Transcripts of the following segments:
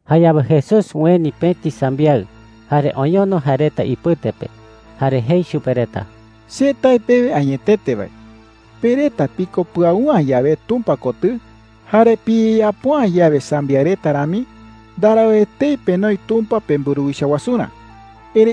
Jayawe Jesús ueni pëti sambiaɨ, jare oñono jae reta ipɨte pe, jare jei chupe reta: “Che tae pewe añetete wae, pe reta piko pɨau’ä yawe Tumpa kotɨ, jare piyeyapo’ä yawe sambiaɨ reta rami, ndarau etei penoi Tumpa pemburuwicha wasurä,” jei.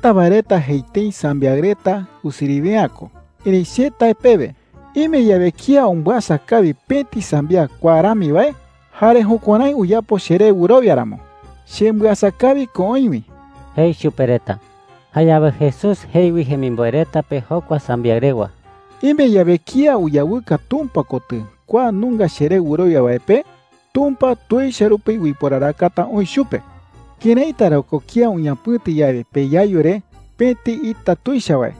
“Jeta wae reta jei tëi sambiaɨ reta usiriwe’ä ko. Erëi che tae pewe, ime yawe kía umbɨasa kawi pëti sambiaɨ kua rami wae, jare jukuärái uyapo cheré wɨrowia ramo, chembɨasa kawi ko oï wi,” jei chupe reta. Jayawe Jesús jei wi jemimboe reta pe jokua sambiaɨ rewa: “Ime yawe kía uyawɨka Tumpa kotɨ kua nunga cheré wɨrowia wae pe, Tumpa tuicha rupi uiporarakata oï chupe,” jei. “¿Këraita ra ko kía uñapɨ̈ti yawe peyayu re pëti ita tuicha wae,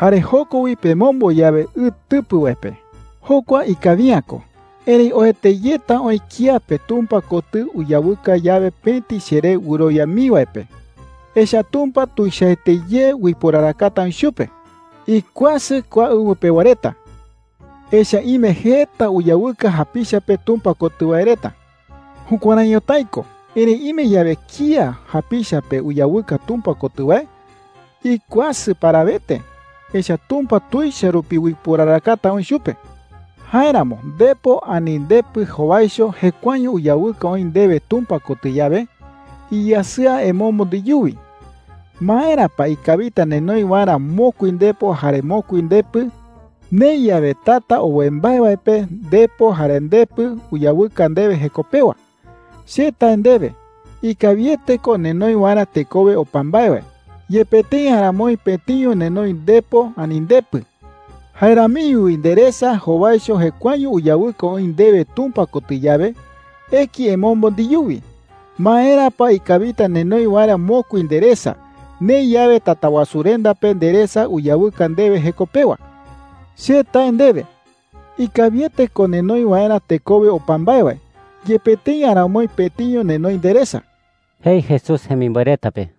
jare joko wi pemombo yawe ɨ tɨpɨ wae pe? Jokua ikawi’ä ko. ¡Erëi oete yeta oï kía pe Tumpa kotɨ uyawɨka yawe pëti cheré wɨrowia mii wae pe! Echa’ä Tumpa tuichaete ye uiporarakata oï chupe,” jei. “¡Ikuasɨ kua ɨwɨ pewa reta, echa’ä ime jeta uyawɨka japicha pe Tumpa kotɨ wae reta! Jukuärái ñotái ko. Erëi ime yawe kía japicha pe uyawɨka Tumpa kotɨ wae, ¡ikuasɨ parawete! Echa’ä Tumpa tuicha rupi uiporarakata oï chupe,” jei chupe reta. “Jáeramo ndepo ani ndepɨ jowaicho jekuaeño uyawɨka oï ndewe Tumpa kotɨ yawe, iyasɨa emombo ndeyuwi. ¿Maera pa ikawita nenoi waerä mokui ndepo jare mokui ndepɨ, neï yawe tata owe mbae wae pe ndepo jare ndepɨ uyawɨka ndewe jeko pewa? Che tae ndewe, ikawiete ko nenoi waerä tekowe opa mbae wae, yepe tëi aramoi pëtiño nenoi ndepo ani ndepɨ,” jei chupe reta. “Jae ramiño wi nderesa jowaicho jekuaeño uyawɨka oï ndewe Tumpa kotɨ yawe, eki emombo ndeyuwi. ¿Maera pa ikawita nenoi waerä mokui nderesa, neï yawe Tatawasurenda pe nderesa uyawɨka ndewe jeko pewa? Che tae ndewe, ikawiete ko nenoi waerä tekowe opa mbae wae, yepe tëi aramoi pëtiño nenoi nderesa,” jei Jesús jemimboe reta pe.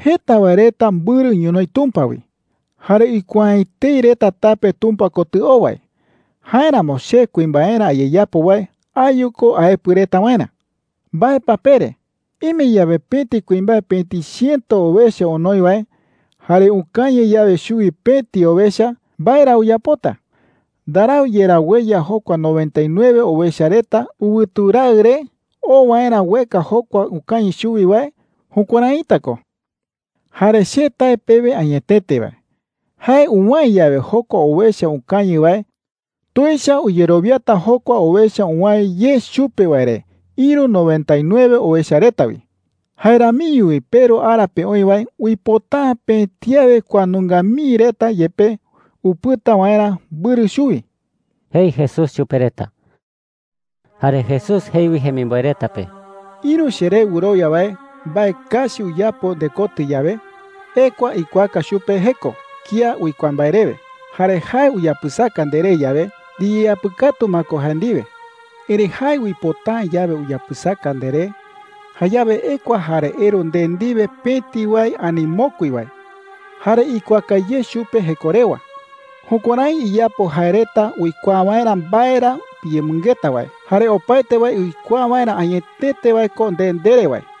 “Jeta wae reta mbɨrɨ ñonoï Tumpa wi, jare uikuaa’ä etei reta tape Tumpa kotɨ oo wae. Jáeramo che kuimbaerä ayeyapo wae ayu ko aepɨ reta waerä,” jei. “¿Mbae pa pere? Ime yawe pëti kuimbae pëti chiëto owecha onoi wae, jare ukañɨ yawe chuwi pëti owecha, ¿mbae ra uyapota? ¿Ndarau yerá ueya jokua noventa y nueve owecha reta ɨwɨtu raɨ re oo waerä ueka jokua ukañɨ chuwi wae? Jukuäraita ko,” jei. “Jare che tae pewe añetete wae, jae uwäe yawe jokua owecha ukañɨ wae, tuicha uyerowiata jokua owecha uwäe ye chupe wae re ïru noventa y nueve owecha reta wi,” jei. “Jae ramiño wi peRu ara pe oï wae uipota’ä pëti awe kua nunga mii reta yepe upɨta waerä mbɨrɨ chuwi,” jei Jesús chupe reta. Jare Jesús jei wi jemimboe reta pe: “Ïru cheré wɨrowia wae mbae kachi uyapo ndekotɨ yawe, ekua ikuaaka chupe jeko kía uikuaa mbae rewe. Jare jae uyapɨsaka nderé yawe, ndiyeapɨkatu ma ko jae ndiwe,” jei. “Erëi jae uipota’ä yawe uyapɨsaka nderé, jayawe ekua jare eru nde ndiwe pëti wae ani mokui wae, jare ikuaaka ye chupe jeko rewa. Jukuärái iyapo jae reta uikuaa waerä mbae ra piyemɨngeta wae, jare opaete wae uikuaa waerä añetete wae ko nde ndere wae,” jei.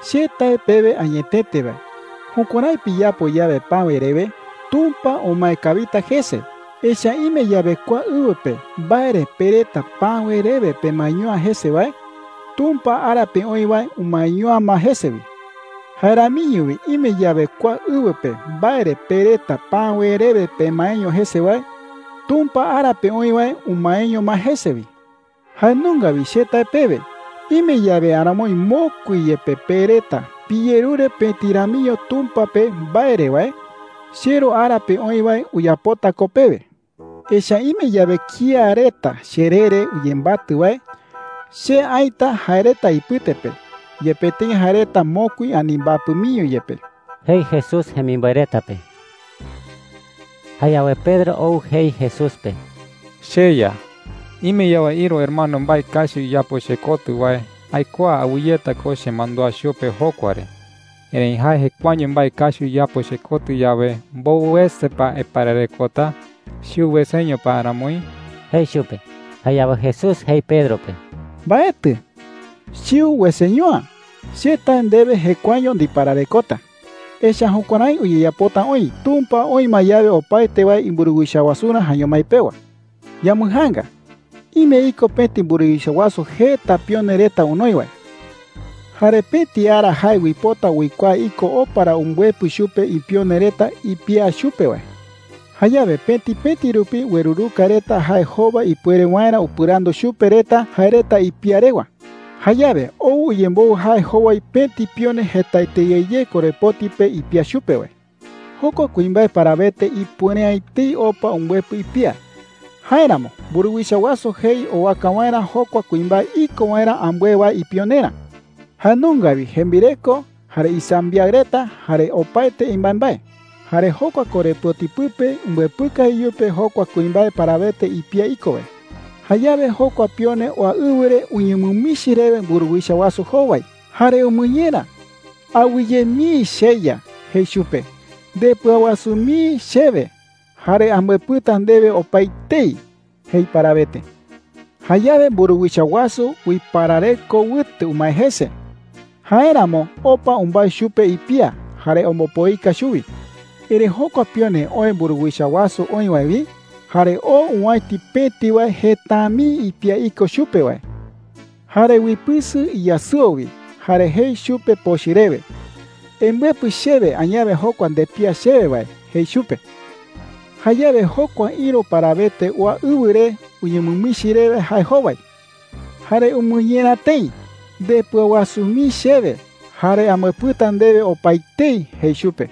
“Che tae pewe añetete wae, jukuärái piyapo yawe päwe rewe, Tumpa umae kawita jese. Echa’ä ime yawe kua ɨwɨ pe mbae re pe reta päwe rewe pemaeño’ä jese wae, Tumpa ara pe oï wae umaeño’ä ma jese wi. Jae ramiño wi ime yawe kua ɨwɨ pe mbae re pe reta päwe rewe pemaeño jese wae, Tumpa ara pe oï wae umaeño ma jese wi,” jei chupe reta. “Jae nunga wi che tae pewe, ime yawe aramoi mokui yepe pe reta piyerure pëti ramiño Tumpa pe mbae re wae, cheRu ara pe oï wae uyapota ko pewe,” jei. “Echa’ä ime yawe kía reta cheree re uyembatɨ wae, che aïta jae reta ipɨte pe, yepe tëi jae reta mokui ani mbapɨ miño yepe,” jei Jesús jemimboe reta pe. Jayawe Pedro ou jei Jesús pe: “CheYa,” jei chupe. “Ime yawe ïru hermano mbae kachi uyapo chekotɨ wae, aikuaa awɨyeta ko chemandúa chupe jokua re. Erëi jae jekuaeño mbae kachi uyapo chekotɨ yawe, ¿mbowɨ wese pa aipararekota? ¿Chiu weseño pa aramoi?” jei chupe. Jayawe Jesús jei Pedro pe: “Mbaetɨ,” jei. “Chiu weseño’ä. Che tae ndewe, jekuaeño ndipararekota. Echa’ä jukuärái uyeyapota oï Tumpa oï ma yawe opaete wae imburuwicha wasurä jaeño mái pewa,” jei. “Yambɨjaanga. Ime iko pëti mburuwicha wasu jeta pione reta onoi wae. Jare pëti ara jae uipota uikuaa iko opa ra umbɨepɨ chupe ipione reta ipía chupe wae. Jayawe pëti pëti rupi ueruruka reta jae jowai ipuere waerä upɨrandu chupe reta jae reta ipía rewa,” jei. “Jayawe ou uyemboɨ jae jowai pëti pione jetaete ye ye korepoti pe ipía chupe wae,” jei. “Jokua kuimbae parawete ipuere’ä etei opa umbɨepɨ ipía. Jáeramo mburuwicha wasu jei owaka waerä jokua kuimbae iko waerä ambɨe wae ipionerä – jae nunga wi jembireko, jare isambiaɨ reta, jare opaete imbaembae. Jare jokua korepoti pɨpe umbɨepɨka iyupe jokua kuimbae parawete ipía iko wae,” jei. “Jayawe jokua pione oa ɨwɨ re uñemɨmichi rewe mburuwicha wasu jowai, jare umɨñera: ‘Awɨye mii, cheya,’ jei chupe. ‘Ndepɨawasu mii chewe, jare ambɨepɨta ndewe opaetei,’ jei parawete. Jayawe mburuwicha wasu uiparareko wɨte umae jese. Jáeramo opa umbái chupe ipía jare ombopoika chuwi,” jei. “Erëi jokua pione oë mburuwicha wasu oï wae wi, jare oo owäiti pëti wae jeta’ä mii ipía iko chupe wae. Jare uipɨsɨ iyasɨo wi jare jei chupe pochɨ rewe: ‘Embɨepɨ chewe añawe jokua ndepía chewe wae,’ jei chupe. “Jayawe jokua ïru parawete oa ɨwɨ re uñemɨmichi rewe jae jowai, jare umɨñera tëi: ‘Ndepɨawasu mii chewe, jare ambɨepɨta ndewe opaetei,’ jei chupe.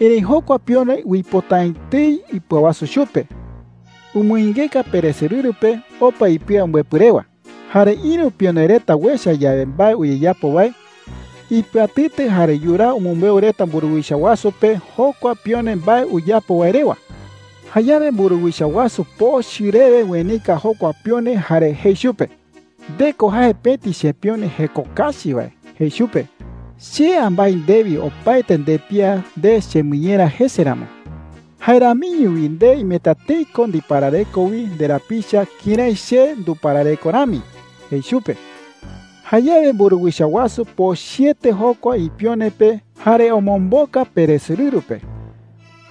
Erëi jokua pione uipota’ä etei ipɨawasu chupe. Umɨingeka peresorɨru pe opa ipía umbɨepɨ rewa,” jei. “Jare ïru pione reta uecha yawe mbae uyeyapo wae, ipɨatɨtɨ jare yuraa umɨmbeu reta mburuwicha wasu pe jokua pione mbae uyapo wae rewa. Jayawe mburuwicha wasu pochɨ rewe uenika jokua pione jare jei chupe: ‘¡Nde ko jae pëti chepione jeko kachi wae!’ jei chupe. ‘Che ambái ndewi opaete ndepía nde chemɨñera jese ramo. Jae ramiño wi nde imeta tëi ko ndiparareko wi nderapicha kërái che nduparareko rami,’ jei chupe. Jayawe mburuwicha wasu pochɨete jokua ipione pe jare omomboka peresorɨru pe.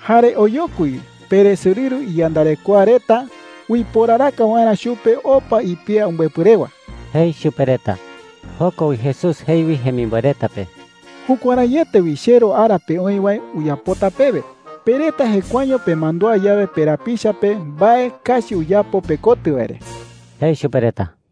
Jare oyokui wi peresorɨru iyandarekoa reta uiporaraka waerä chupe opa ipía umbɨepɨ rewa,” jei chupe reta. Joko wi Jesús jei wi jemimboe reta pe: “Jukuäraiete wi cheRu ara pe oï wae uyapota pewe, pe reta jekuaeño pemandúa yawe perapicha pe mbae kachi uyapo pekotɨ wae re,” jei chupe reta.